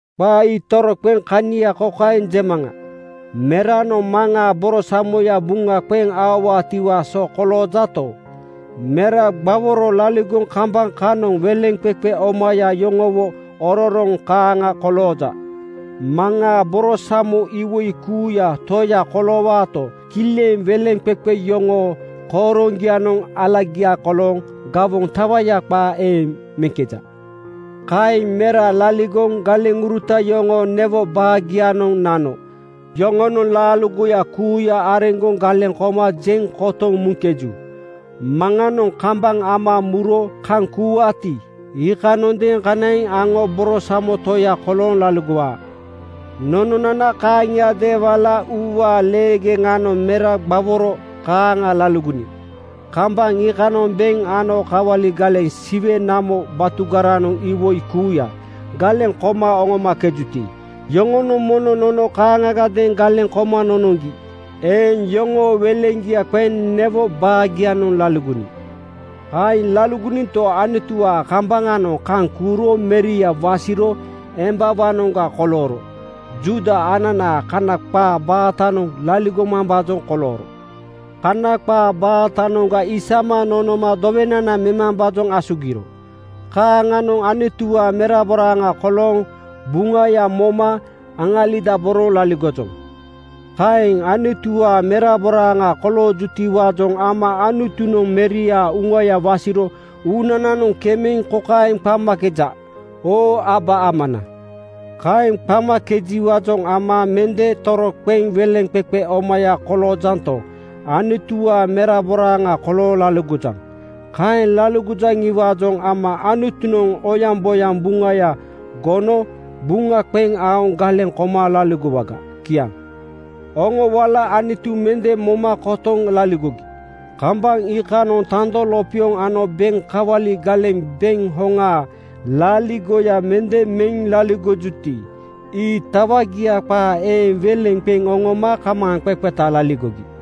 Qaa ii toroqeŋ kania kokaeŋ jemaŋa: Meranoŋ maŋaa borosamoya buŋa qeŋ aowaatiwaa so koloojato, mera gbaworo laligoŋ kambaŋ kanoŋ weleŋqeqe omaya yoŋowo ororoŋ kaaŋa kolooja. Maŋaa borosamo iwoi kuuyaa toya koloowaato, kileŋ weleŋqeqe yoŋoo kooroŋgianoŋ alagiaga kolooŋ gawoŋ tawaya qaa eeŋ meŋkeja. Kaeŋ mera laligoŋ galeŋuruta yoŋoo newo baagianoŋ nano yoŋonoŋ laaligoya kuuya areŋgoŋ galeŋ koma jeŋ kotoŋ muŋkeju. Maŋanoŋ kambaŋ ama muro kaŋ kuuwaati, iikanoŋadeeŋ kanaiŋ aŋo borosamo toya kolooŋ laligowaa. Nononana kaaŋiadeeŋ wala uuwaa leegeŋanoŋ mera gbaworo kaaŋa laligoniŋ. Kambaŋ iikanoŋ beŋ ano kawali galeŋ Siwe namo batugaranoŋ iwoi kuuya galeŋ koma oŋomakejuti, iyoŋonoŋ mono nono kaaŋagadeeŋ galeŋ koma nonoŋgi eeŋ yoŋoo weleŋgia qeŋ newo baagianoŋ laligoniŋ. Kaeŋ laligoninto, Anutuwaa kambaŋanoŋ kaŋ kuuro Meria wasiro embawaanoŋga kolooro. Juuda ananaa Kana qaa baatanoŋ laligomambaajoŋ kolooro. Kana qaa baatanoŋga isama nonoma dowenana memambaajoŋ asugiro. Kaaŋanoŋ Anutuwaa meraboraaŋa kolooŋ buŋaya moma aŋalidaboroŋ laligojoŋ. Kaeŋ Anutuwaa meraboraaŋa koloojutiwaajoŋ ama Anutunoŋ Meriaa Uŋaya wasiro uunananoŋ kemeŋ kokaeŋ qamakeja, “Oo Aba Amana!” Kaeŋ qamakejiwaajoŋ ama mende toroqeŋ weleŋqeqe omaya koloojanto, Anutuwaa meraboraaŋa kolooŋ laligojaŋ. Kaeŋ laligojaŋiwaajoŋ ama Anutunoŋ oyaŋboyaŋ Buŋaya gono buŋa qeŋ aoŋ galeŋ koma laligowaga. Kiaŋ. Oŋo wala Anutu mende moma kotoŋ laligogi. Kambaŋ iikanoŋ tando lopioŋ ano beŋ kawali galeŋ beŋ hoŋaa laaligoya mende meŋ laligojuti, ii tawagia qaa eeŋ weleŋ qeŋ oŋoma kamaaŋqeqeta laligogi.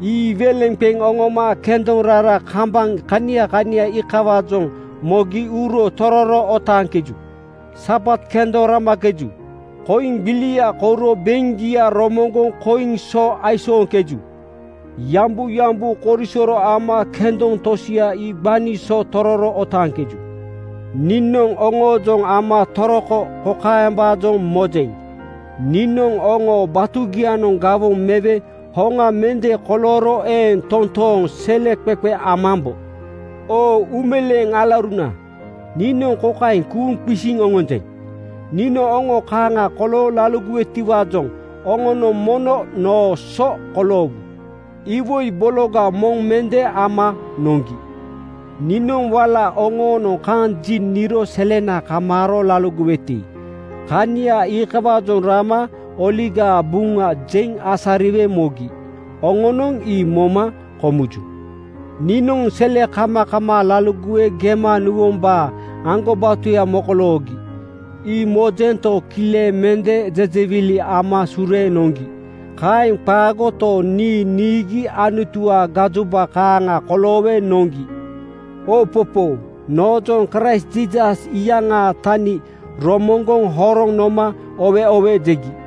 Ii weleŋ qeŋ oŋoma kendoŋ rara kambaŋ kania kania iikawaajoŋ mogi uro tororo otaaŋkeju. Sabat kendoŋ ramakeju. Koiŋ gbilia kouro beŋgia romoŋgoŋ koiŋ so aisooŋkeju. Yambuyambu korisoro ama kendoŋ tosia ii gbani so tororo otaaŋkeju. Niinoŋ oŋoojoŋ ama toroko kokaembaajoŋ mojeŋ: Niinoŋ oŋoo batugianoŋ gawoŋ mewe hoŋa mende kolooro eeŋ toontooŋ seleqeqe amambo. Oo uumeleeŋ alauruna, niinoŋ kokaeŋ kuuŋ qisiŋ oŋonjeŋ: Niinoŋ oŋo kaaŋa kolooŋ laligowetiwaajoŋ oŋonoŋ mono noo so koloowu. Iwoi bologa moŋ mende ama noŋgi. Niinoŋ wala oŋoonoŋ kaŋ ji niro selena kamaaro laligoweti, kania iikawaajoŋ rama Oligaa Buŋa jeŋ asariwe mogi. Oŋonoŋ ii moma komuju. Niinoŋ selekamakamaa laligowe gema nuwombaa aŋgobatoya mokoloogi, ii mojento, kileŋ mende jejewili ama sureeŋ noŋgi. Kaeŋ qaagoto, nii niigi Anutuwaa gajoba kaaŋa koloowe noŋgi. Oopopoo, noojoŋ Kraist Jiisas iyaŋaa tani romoŋgoŋ horoŋ noma “Oowe oowe!” jegi.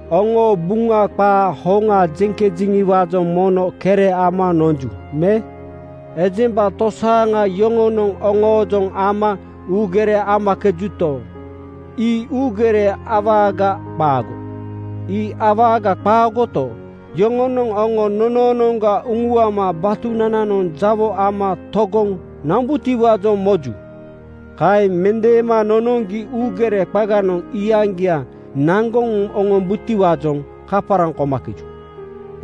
Oŋoo Buŋa qaa hoŋa jeŋkejeŋiwaajoŋ mono kere ama nonju me? Ejemba tosaaŋa yoŋonoŋ oŋoojoŋ ama uugere amakejuto, ii uugere awaaga qaago. Ii awaaga qaagoto, yoŋonoŋ oŋo nonoonoŋga uŋuama batunananoŋ jawo ama togoŋ nombutiwaajoŋ moju. Kaeŋ mendeema nonoŋgi uugere qaganoŋ iyaŋgia naŋgoŋ oŋom-butiwaajoŋ kaparaŋ komakeju.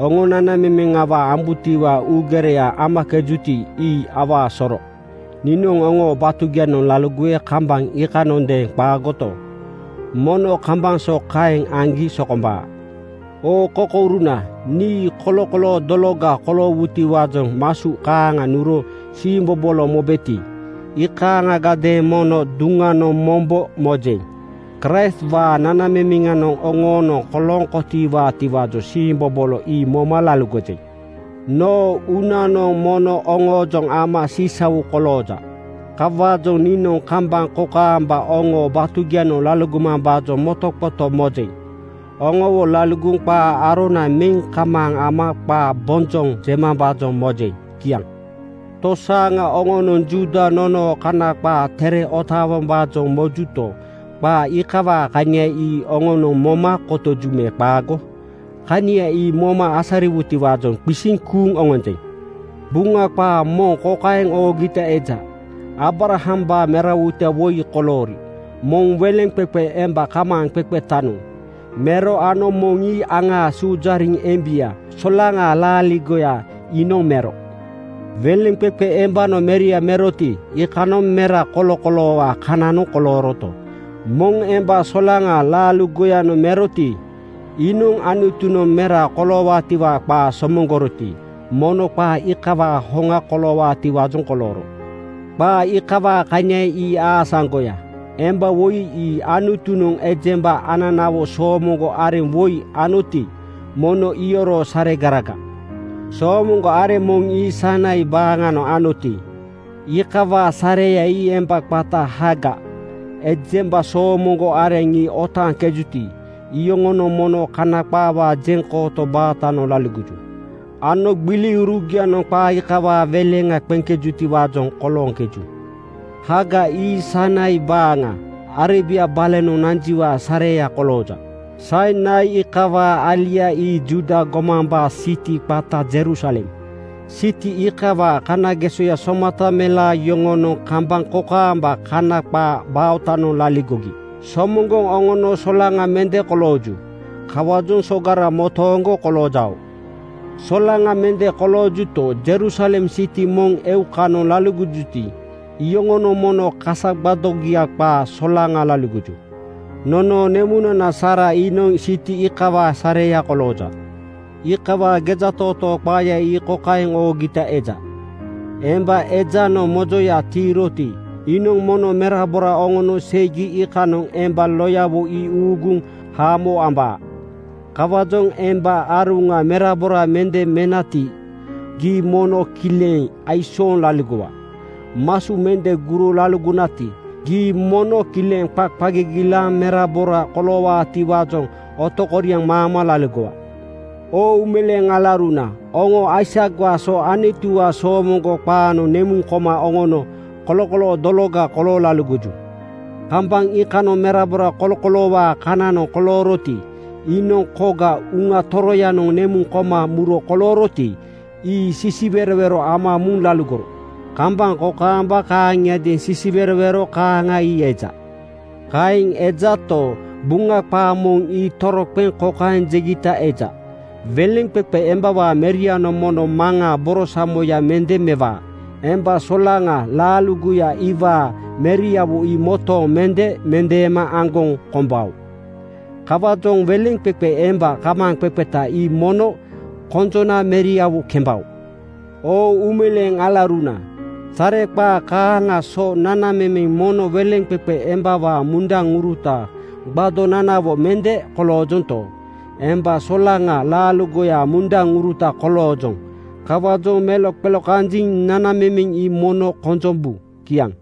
Oŋo nanamemeŋ awaa ambutiwaa uugereya amakejuti, ii awaa soro. Niinoŋ oŋoo batugianoŋ laligowe kambaŋ iikanoŋadeeŋ qaagoto, mono kambaŋ so kaeŋ aŋgi sokombaa. Oo kokouruna, nii kolokoloo dologa koloowutiwaajoŋ masu kaaŋa nuro siimbobolo mobeti, iikaaŋagadeeŋ mono duŋanoŋ mombo mojeŋ. Kraistwaa nanamemeŋanoŋ oŋoonoŋ kolooŋ kotowaatiwaajoŋ siimbobolo ii moma laligojeŋ. Noo uunanoŋ mono oŋoojoŋ ama sisau kolooja. Kawaajoŋ niinoŋ kambaŋ kokaamba oŋoo batugianoŋ laligomambaajoŋ motoqoto mojeŋ. Oŋowo laligoŋ qaa arona meŋ kamaaŋ ama qaa bonjoŋ jemambaajoŋ mojeŋ. Kiaŋ. Tosaaŋa oŋonoŋ Juuda nonoo Kana qaa Tere otaawombaajoŋ mojuto, qaa iikawaa kania ii oŋanoŋ moma kotoju me qaago? Kania ii moma asariwutiwaajoŋ qisiŋ kuuŋ oŋonjeŋ. Buŋa qaa moŋ kokaeŋ oogita eja: Aabrahambaa merawoita woi koloori: Moŋ weleŋqeqe emba kamaaŋqeqetanoŋ (sleiw) mero ano moŋ ii aŋaa suujariŋ embia (frii) solaŋa laaligoya iinoŋ mero. Weleŋqeqe embanoŋ meria meroti, iikanoŋ mera kolokoloowaa kananoŋ kolooroto, moŋ emba (frii) solaŋa laaligoyanoŋ meroti, iinoŋ Anutunoŋ mera koloowaatiwaa qaa somoŋgoroti, mono qaa iikawaa hoŋa koloowaatiwaajoŋ kolooro. Qaa iikawaa kania ii aasaŋgoya. Emba woi ii Anutunoŋ ejemba ananawo soomoŋgo areŋ woi anoti, mono iyoroo saregaraga. Soomoŋgo areŋ moŋ ii Sainai (Sinai) baaŋanoŋ anoti, iikawaa sareya ii emba qata Haagar. Ejemba soomoŋgo areŋ ii otaaŋkejuti, iyoŋonoŋ mono Kana qaawaa jeŋkooto baatanoŋ laligoju ano gbiliurugianoŋ qaa iikawaa weleŋa qeŋkebutiwaajoŋ kolooŋkeju. Haagar ii Sainai baaŋa, Arebia balonoŋ nanjiwaa sareya kolooja. Sainai iikawaa alia ii Juuda gomambaa siti qata Jerusalem. Siti iikawaa kanagesoya somata melaa yoŋonoŋ kambaŋ kokaamba Kana qaa baatanoŋ laligogi somoŋgoŋ oŋono solaŋa (frii) mende kolooju. Kawaajoŋ sogara motooŋgo koloojao. Solaŋa (frii) mende koloojuto, Jerusalem siti moŋ eukanoŋ laligojuti, iyoŋonoŋ mono kasa gbadogia qaa solaŋa laligoju. Nonoo nemunana Saara iinoŋ siti iikawaa sareya kolooja. Iikawaa gejatootoo qaaya ii kokaeŋ oogita eja, “Emba ejanoŋ mojoya tiiroti, iinoŋ mono merabora oŋono seigi iikanoŋ emba loyawo ii uuguŋ haamo ambaa. Kawaajoŋ emba aruŋa merabora mende menati, gii mono kileŋ aisooŋ laligowa. Masu mende guro laligonati, gii mono kileŋ qa gigilaaŋ merabora koloowaatiwaajoŋ otokoriaŋ maama laligowa.” Oo uumeleeŋ alauruna, oŋo Aisakwaa so Anutuwaa soomoŋgo qaanoŋ nemuŋ koma oŋono kolokoloo dologa kolooŋ laligoju. Kambaŋ iikanoŋ merabora kolokoloowaa kananoŋ kolooroti, iinoŋ koga Uŋa Toroyanoŋ nemuŋ koma muro kolooroti, ii sisiwerowero ama muŋ laligoro. Kambaŋ kokaamba kaaŋiadeeŋ sisiwerowero kaaŋa ii eja. Kaeŋ ejato, Buŋa qaa moŋ ii toroqeŋ kokaeŋ jegita eja, “Weleŋqeqe embawaa merianoŋ mono Maŋaa borosamoya mende mewaa. Emba solaŋa laaligoya iwaa meriawo ii motooŋ mende mendeema aŋgoŋ kombao. Kawaajoŋ weleŋqeqe emba kamaaŋqeqeta ii mono konjona meriawo kembao.” Oo uumeleeŋ alauruna, sareqaa kaaŋaa so anana mono weleŋqeqe embawaa mundaŋuruta gbadonanawo mende koloojonto, emba solaŋa laaligoyaa mundaŋuruta koloojoŋ. Kawaajoŋ meloqelokanjiŋ nanamemeŋ ii mono konjombu. Kiaŋ.